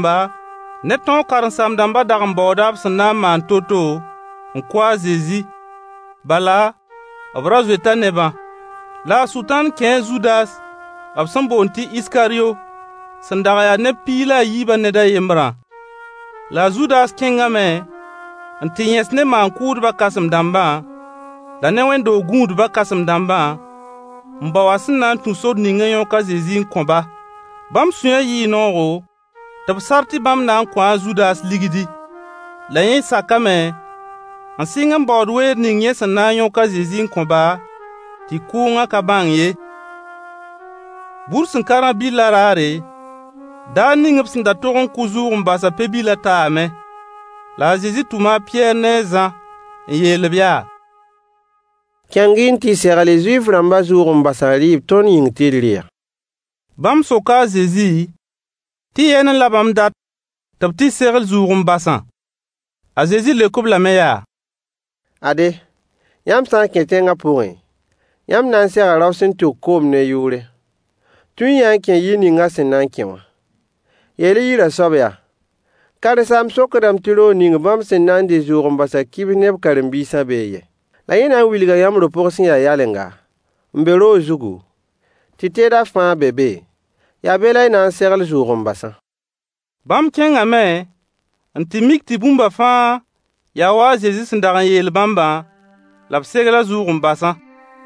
Maan-kʋʋdbã kãsem-dãmba ne tõog karen-saam-dãmbã dag n baooda b sẽn na n maan to-to n kʋ a Zezi. Bala, b ra zoeta nebã. La a Sʋtãan kẽe a Zudas, b sẽn boond tɩ Iskaryo, sẽn dag n ya neb piig la a yiibã ned a yembrã. La a Zudas kẽngame n tɩ yẽs ne maan-kʋʋdbã kãsem-dãmbã la ne wẽnd-doog gũudbã kãsem-dãmbã, n bao a sẽn na n tũ sor ning n yõk a Zezi n kõ-ba. Bãmb sũyã yɩɩ noogo, tɩ b sar tɩ bãmb na n kõo a Zudas ligdi. La yẽ sakame, n sɩng n baood weer ning yẽ sẽn na n yõk a Zezi n kõ-ba, tɩ kʋʋngã ka bãng ye. Bur sẽn ka rã-bɩllã raare, daar ning b sẽn da tog n kʋ zʋʋg-n-basã pe-bilã taame. La a Zezi tʋma a Pɩyɛɛr ne a Zã n yeel-b yaa: Kẽng-y n tɩ segl-y Zuif-rãmbã zʋʋg-n-basã rɩɩb tõnd yĩng tɩ d rɩ-a. Bãmb soka a Zezi tɩ yɛɛne la bãmb dat tɩ b tɩ segl zʋʋg-n-basã. A Zezi leok-b lame yaa: Ade, yãmb sã n kẽ tẽngã pʋgẽ, yãmb na n sega rao sẽn tʋk koom ne yʋʋre. Tũ-y-yã-a n kẽ yir ning a sẽn na n kẽ wã. Yeel-y yirã soab yaa: “Karen-saamb sokdame tɩ roog ning bãmb sẽn na n dɩ zʋʋg-n-basã kibs ne b karen-biisã bee yɛ?” La yẽ na n wilga yãmb do-pʋg sẽn ya yalenga n be roog zugu, tɩ teedã fãa be be, yaa be la y na n segl zʋʋg-n-basã. Bãmb kẽngame, n tɩ mik tɩ bũmba fãa yaa wa a Zezi sẽn dag n yeel bãmbã, la b segla zʋʋg-n-basã.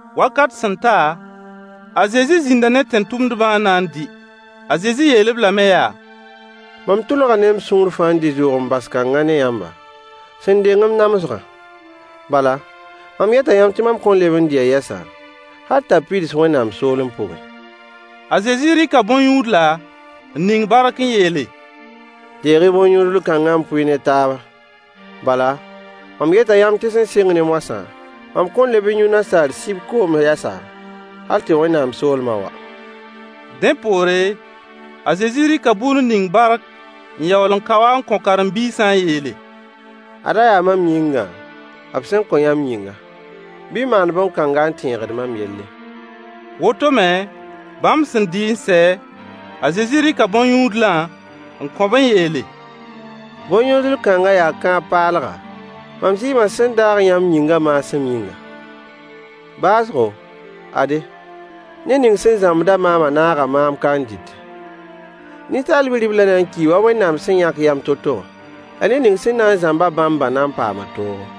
Wakat sẽn ta, a Zezi zĩnda ne tẽn-tʋmdbã n na n dɩ. A Zezi yeel-b lame yaa: Mam tʋlga ne m sũur fãa n dɩ zʋʋg-n-bas kãngã ne yãmba, sẽn deng m namsgã. Bala, mam yeta yãmb tɩ mam kõn leb n dɩ-a yɛsa, hal t'a pids Wẽnnaam soolem pʋgẽ. A Zezi rɩka bõn-yũudla n ning bark n yeele: Deeg-y bõn-yũudl-kãngã n pʋɩ ne taaba. Bala, mam yeta yãmb tɩ sẽn sɩng ne mõsã, mam kõn leb n yũ nasaar sib koom yɛsa, hal tɩ Wẽnnaam soolmã wa. Dẽ poore, a Zezi rɩka bur n ning bark n yaool n kao-a n kõ karen-biisã n yeele: Ada yaa mam yĩnga, b sẽn kõ yãmb yĩnga. [Bɩ y maand bõn-kãnga n tẽegd mam yelle. Woto me, bãmb sẽn dɩ n sɛ, a Zezi rɩka bõn-yũudlã n kõ-b n yeele: Bõn-yũudl kãngã yaa kãab paalga, mam zɩɩmã sẽn daag yãmb yĩngã maasem yĩnga.] Baoosgo, ade, ned ning sẽn zãmbd-a maamã naaga maam ka n dɩtẽ. Ninsaal Bi-riblã na n kii wa Wẽnnaam sẽn yãk yam to-to wã. La ned ning sẽn na n zãmb-a bãmbã na n paama toogo.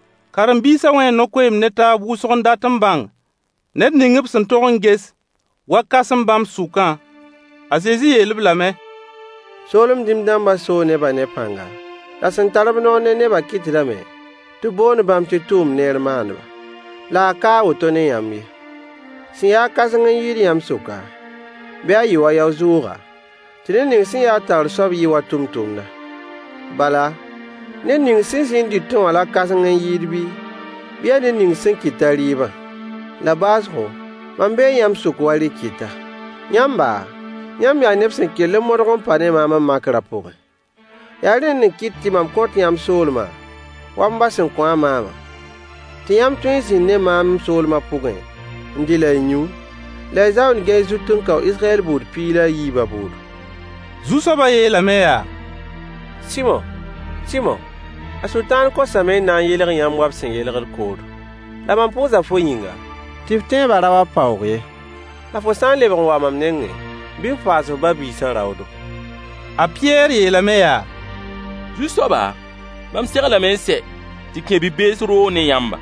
Karen-biisã wẽe no-koeemd ne taab wʋsg n dat n bãng ned ning b sẽn tog n ges wa kãsem bãmb sʋkã. A Zezi yeel-b lame: Soolem dĩm-dãmbã soo nebã ne pãnga, la sẽn tar-b noor ne nebã kɩtdame tɩ b boond bãmb tɩ tʋʋm neer maandba. La a ka a woto ne yãmb ye. Sẽn ya-a kãseng n yɩɩd yãmb sʋka, bɩ a yɩ wa yao-zʋʋga, tɩ ned ning sẽn ya-a taoor soab yɩ wa tʋmtʋmda. Bala, ned ning sẽn zĩ n dɩtẽ wã la kãseng n yɩɩd bii, bɩ yaa ned ning sẽn kɩt-a rɩɩbã? La baoosgo, mam bee yãmb sʋk wa rɩ-kɩta. Yãmba, yãmb yaa neb sẽn kell n modg n pa ne maam m makrã pʋgẽ. Yaa rẽnd n kɩt tɩ mam kõt yãmb soolmã, wa m ba sẽn kõ-a maamã, tɩ yãmb tõe n zĩnd ne maam m soolmã pʋgẽ n dɩ la y yũ, la y zaoond gɛy zut n kao Israyɛl buud piig la a yiibã bʋʋdo. Zu-soabã yeelame yaa: Sɩmo! Sɩmo a Sʋtãaan kosame n na n yelg yãmb wa b sẽn yelgd koodo. La mam pʋʋsa fo yĩnga, tɩ f tẽeba ra wa paoog ye. La fo sã n lebg n wa mam nengẽ, bɩ f paas f ba-biisã raoodo. A Pɩyɛɛr yeelame yaa: Zu-soaba, mam seglame n sɛ tɩ kẽ bi-bees roog ne yãmba,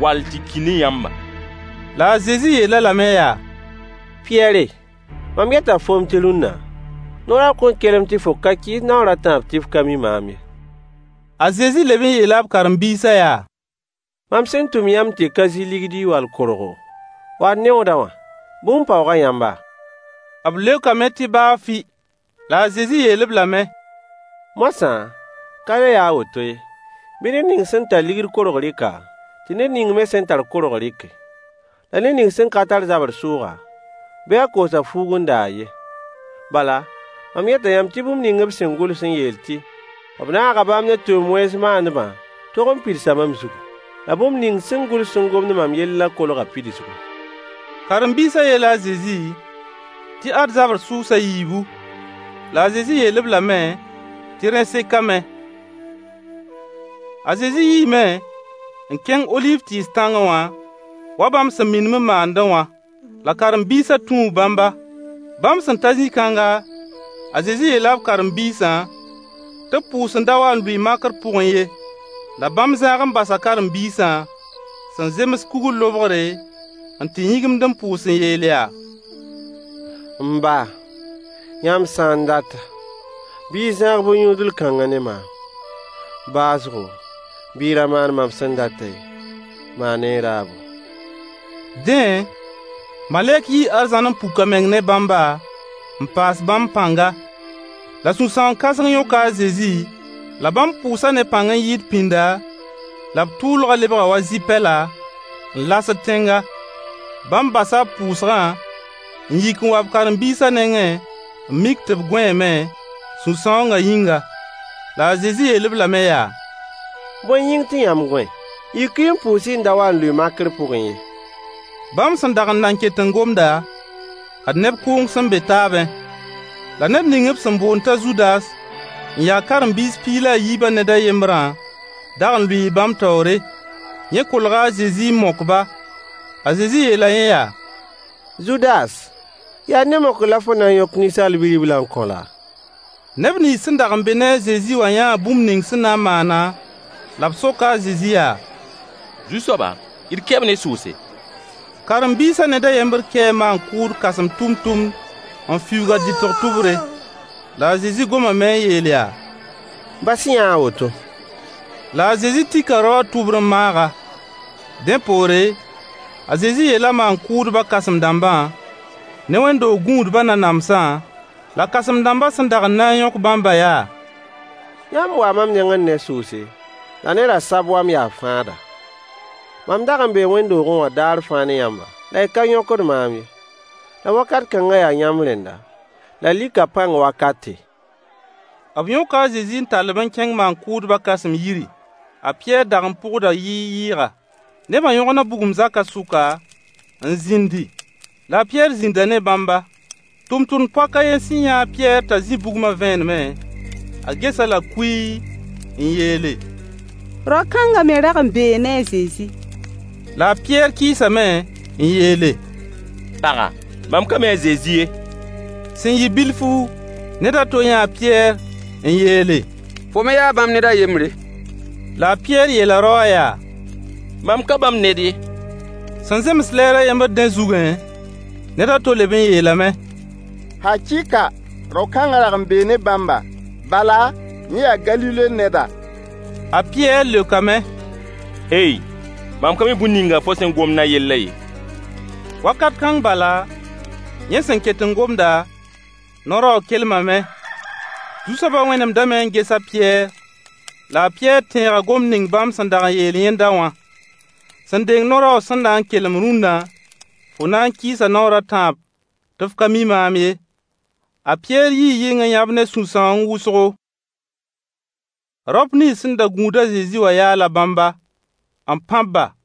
wall tɩ ki ne yãmba. La a Zezi yeel-a lame yaa: Pɩyɛɛr, mam yeta foom tɩ rũnna, no-raoog kõn kelem tɩ fo ka kɩɩs noor a tãab tɩ f ka mi maam ye. A Zezi leb n yeela b karen-biisã yaa: Mam sẽn tʋm yãmb tɩ y ka zɩ ligdi wall korgo, wall neooda wã, bũmb paooga yãmba? B leokame tɩ baa fɩ. La a Zezi yeel-b lame: Moasã, ka le yaa a woto ye. Bɩ ned ning sẽn tar ligd korg rɩk-a, tɩ ned ning me sẽn tar korg rɩke. La ned ning sẽn ka tar zabr sʋʋga, bɩ a koos a fuug n da a yen. Bala, mam yeta yãmb tɩ bũmb ning b sẽn gʋls n yeel tɩ “b naaga bãmb ne tʋʋm-wẽns maandbã” tog n pidsa mam zugu. La bũmb ning sẽn gʋls n gomd mam yellã kolga pidsgu. Karen-biisã yeela a Zezi tɩ ad zabr sʋʋs a yiibu. La a Zezi yeel-b lame tɩ rẽ sekame. A Zezi yiime n kẽng oliiv tɩɩs tãngẽ wã, wa bãmb sẽn minim n maandẽ wã. La karen-biisã tũu bãmba. Bãmb sẽn ta zĩ-kãnga, a Zezi yeela b karen-biisã tɩ b pʋʋs n da wa n lʋɩ makr pʋgẽ ye. La bãmb zãag n basa karen-biisã, sẽn zems kugr lobgre, n tɩ yĩgimd n pʋʋs n yeel yaa: M ba, yãmb sã n data, bɩ y zãag bõn-yũudl kãngã ne maam. Baoosgo, bɩ y ra maan mam sẽn datã ye, maan-y y raabo. [ Dẽ, malɛk yii arzãn n puk a meng ne bãmba n paas bãmb pãnga. La sũ-sãoong-kãseng yõka a Zezi, la bãmb pʋʋsa ne pãng n yɩɩd pĩnda, la b tʋʋlgã lebga wa zɩ-pɛla, n lasd tẽnga.] Bãmb basa b pʋʋsgã n yik n wa b karen-biisã nengẽ n mik tɩ b gõeeme, sũ-sãoongã yĩnga. La a Zezi yeel-b lame yaa: Bõe yĩng tɩ yãmb gõe? Yik-y n pʋʋs-y n da wa n lʋɩ makr pʋgẽ ye. Bãmb sẽn dag n nan ket n gomda, ad neb kʋʋng sẽn be taabẽ! La ned ning b sẽn boond t'a Zudas, n ya karen-biis piig la yiibã ned a yembrã dag n lʋɩɩ bãmb taoore. Yẽ kolga a Zezi n mok-ba. A Zezi yeela yẽ yaa: Zudas, yaa ne mokr la fo na n yõk Ninsaal Bi-riblã n kõ laa? Neb nins sẽn dag n be ne a Zezi wã yãa bũmb ning sẽn na n maanã, la b soka a Zezi yaa: Zu-soaba, d kɛ-b ne sʋʋse? Karen-biisã ned a yembr kɛɛ maan-kʋʋdbã kãsem tʋmtʋmd n fiuug a dɩtg tʋbre. La a Zezi gomame n yeel yaa: Bas-y-yã a woto. La a Zezi tika rao wã tʋbr n maag-a. Dẽ poore, a Zezi yeela maan-kʋʋdbã kãsem-dãmbã ne wẽnd-doog gũudbã nanamsã la kãsem-dãmbã sẽn dag n na n yõk bãmbã yaa: Yãmb waa mam nengẽ ne sʋʋse la ne rasab wa m yaa fãada. Mam dag n bee wẽnd-doogẽ wã daar fãa ne yãmba, la y ka yõkd maam ye. La wakat kãngã yaa yãmb rẽnda la likã pãng wakate. B yõka a Zezi n tall-b n kẽng maan-kʋʋdbã kãsem yiri. A Pɩyɛɛr dag n pʋgda yɩɩg-yɩɩga. Nebã yõgna bugum zaka sʋka, n zĩndi. La a Pɩyɛɛr zĩnda ne bãmba. Tʋmtʋmd-poak a yen sẽn yã a Pɩyɛɛr t'a zĩ bugmã vẽenemẽ, a ges-a-la kuii n yeele: Rao-kãnga me rag n bee ne a Zezi. La a Pɩyɛɛr kɩɩsame n yeele: Paga, mam ka mi a Zezi ye. Sẽn yɩ bilfu, ned a to yãa a Pɩyɛɛr n yeele: Fo me yaa bãmb ned a yembre. La a Pɩyɛɛr yeela rao wã yaa: Mam ka bãmb ned ye. Sẽn zems lɛɛr a yembr rẽ zugẽ, ned a to leb n yeelame: Hakɩɩka! Rao-kãngã rag n bee ne bãmba. Bala, yẽ yaa Galile neda. A Pɩyɛɛr leokame: Hey! Mam ka mi bũmb ninga fo sẽn gomd a yellã ye. Wakat kãng bala, yẽ sẽn ket n gomda, no-raoog kelmame. Zu-soaba wẽnemdame n ges a Pɩyɛɛr. La a Pɩyɛɛr tẽega gomd ning bãmb sẽn dag n yeel yẽnda wã: Sẽn deng no-raoog sẽn na n kelem rũnna, fo na n kɩɩsa naoor a tãab tɩ f ka mi maam ye. A Pɩyɛɛr yii yɩng n yãb ne sũ-sãoong wʋsgo. Raop nins sẽn da gũud a Zezi wã yaala bãmba, n pãb-ba.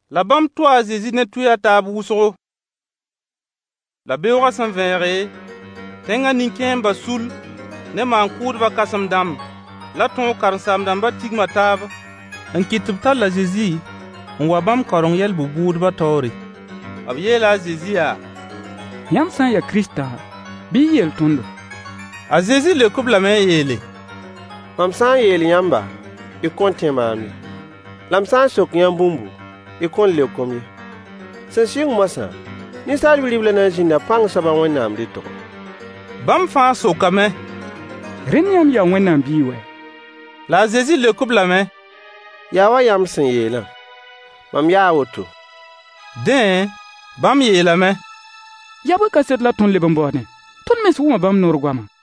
La bãmb tʋʋ a Zezi ne tʋɩy a taab wʋsgo. La beoogã sẽn vẽege, tẽngã nin-kẽembã sull ne maan-kʋʋdbã kãsem-dãmb la tõog karen-saam-dãmbã tigma taab n kɩt tɩ b tall a Zezi n wa bãmb kaoreng yɛl bʋ-bʋʋdbã taoore. B yeela a Zezi yaa: Yãmb sã n yaa Kiristã, bɩ y yeel tõndo. A Zezi leok-b lame n yeele: Mam sã n yeel yãmba, y kõn tẽ maam ye. La m sã n sok yãmb bũmbu, y kõn leok-m ye. Sẽn sɩng moasã, Ninsaal Bi-riblã na n zĩnda pãng soab a Wẽnnaam rɩtgo. Bãmb fãa sokame: Rẽnd yãmb yaa Wẽnnaam biig wɛ? La a Zezi leok-b lame: Yaa wa yãmb sẽn yeelã: “Mam yaa woto.” Dẽ, bãmb yeelame: Yaa bõe kaset la tõnd leb n baoodẽ? Tõnd mens wʋma bãmb noor goama.